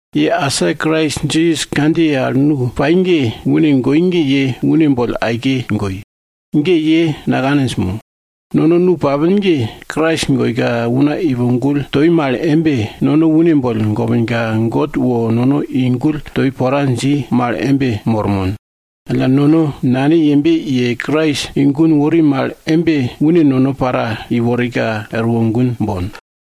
Ye asa Krais Jisas kandjiye al nu pai ge, une goi ge ye une boll aike goi. Ge ye nakaninj mo? Nono nu papin ge, Krais goika una ipo gull toi mal embe, nono une boll gopinka, God wo nono i gull toi pora dji mal embe mormon. Alla nono Nane yembe ye Krais i gun wori mal embe, une nono para iwordaka wor gun bon.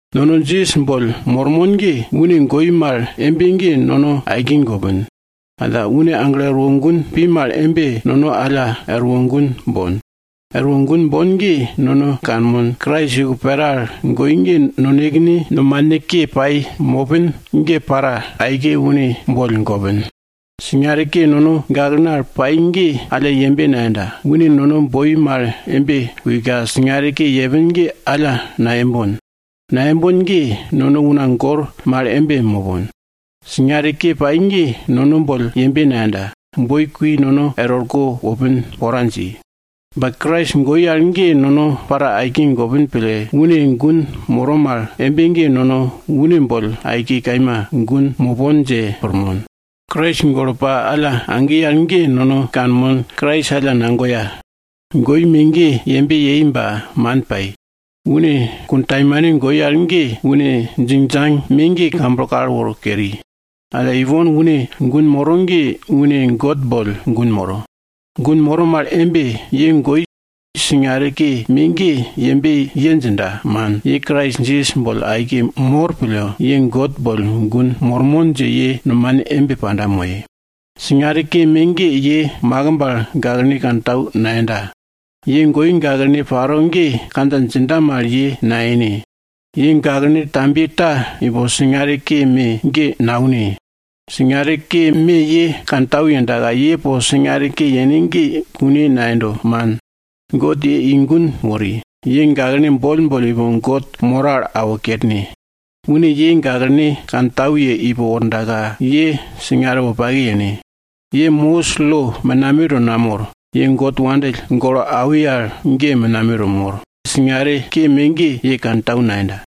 Nono Jisas boll mormon ge, une goi mal embe ge nono aike gopin. Alla une aglo erwo gun pi mal embe, nono alla erwo gun bon. Er wo gun bon ge nono kanmon, Krais iko pera al goi ge, nonekene nomane ke pai mopin ge, para aike une boll gopin. Singare ke nono gaklene al pai ge alla yembe nayenda, une nono boi mal embe kuika singare ke yepin ge alla nayembon. Nayembon ge, nono una gor mal embe mopon. Singare ke pai ge nono boll yembe nayenda, boi kui nono er orko wopin pora dji. Ba Krais goi al ge nono para aike gopin pille, une gun moro mal embe ge nono une boll aike kaima gun mopon dje pirmon. Krais golo pa alla agi al ge nono kanmon, Krais alla nagoya goi me ge yembe yei ba man pai. Une kuntaimane goi al ge, une djingdjang me ge kamblo kal woro keri. Alla ipon une gun moro ge une God boll gun moro. Gun moro mal embe, ye goi, singare ke me ge, yembe ye djinda, man, ye Krais Jisas boll aike mor pille, ye God boll gun mormon dje ye nomane embe panda moye. Singare ke me ge ye makimb al gaklene kantau nayenda. Ye goye gaklene paro ge, kandja djinda mal, ye nayene. Ye gaklene tambiye ta, ipo singare ke me ge naune. Singare ke me ye kantau yendaka ye po singare ke yene ge kune nayendo, man. God ye i gun wori, ye gaklene boll boll ipo God moro al awo kerne. Une ye gaklene kantau ye ipo wordaka, ye singare wopake yene. Ye Mosis lo menameto namor. God nono wopake pille awi al ge ye menameto mor, singare ke me ge ye kantau nayenda.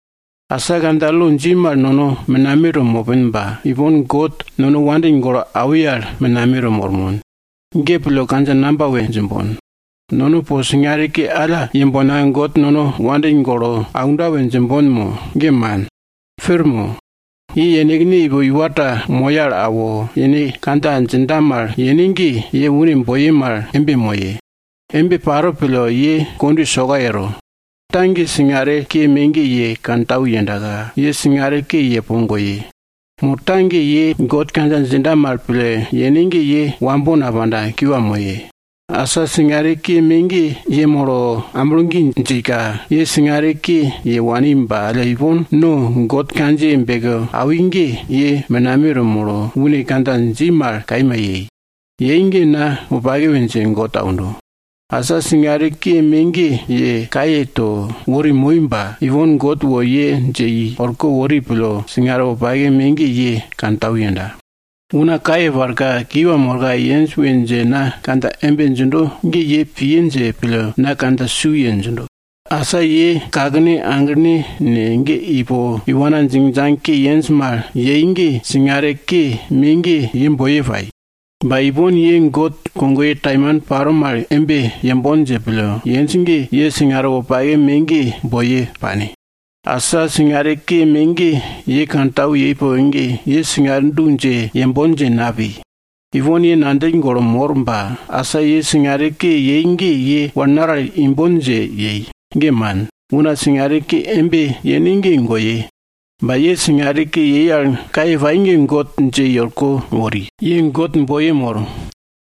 Asa kandja lo dji mal nono menameto mopin ba ipon God nono wopake pille awi al menameto mormon. Ge pille kandja namba we djimbon? Nono po singare ke alla yembonka, God nono wopake pille aunda we djimbon mo? Ge man. Pir mo? Ye yenekne ipo iwa ta moya al awo, yene kandja djinda mal yene ge, ye une nu kogoye mal embe yene. Embe paro pille, ye kondwe soka yero. Ta ge, singare ke me ge ye kantau yendaka, ye singare ke ye po goye. Mo ta ge, ye God kandja djinda mal pille yene ge, ye wambo napanda, kiwa moye. Asa singare ke me ge yemolo amblo gi djika, ye singare ke ye wani ba alla, ipon God kandjiye beke awi ge, ye menameto molo, une kandja dji mal kaima yei. Yei ge na wopake we dje God aundo! Asa singare ke me ge, ye kaye to wori moi ba, ipon God wo ye dje i orko wori pille singare wopake me ge ye kantau yenda. Una kaye parka kiwa morka yenj we dje na kandja embe djindo ge, ye piye dje pille na kandja su ye djindo. Asa ye kakene aglene ne, ge ipo iwana djingdjang ke yenj mal yei ge, singare ke me ge ye boiye pai. Ba ipon ye God kogoye taimane paro mal embe yembon dje pille yenj ge, ye singare wopake me ge boiye pane. Asa, singare ke me ge ye kantau yei poke ge, ye singare du dje yembon dje napi. Ipon ye ngandjill golo mor ba asa ye singare ke yei ge ye wal naral wal imbon dje yei? Ge man. Una singare ke embe yene ge goye. Ba ye singare ke yei al kaye pai ge God dje i orko wori, ye God boiye mor.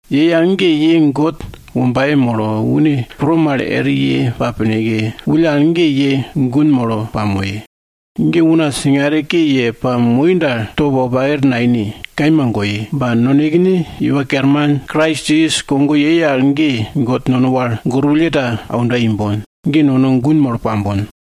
Yei al ge, ye God wombaye molo, une pro mal eri ye pa pineke, wulle al ge ye gun molo pamoye. Alla una singare ke ye pamoi dal, top wopake ta naine, kaima goye. Ba nonekene Iwa Kerman Krais Jisas kogo yei al ge, God nono wal gorwulle ta kiwa aunda imbon. Ge nono gun molo pambon.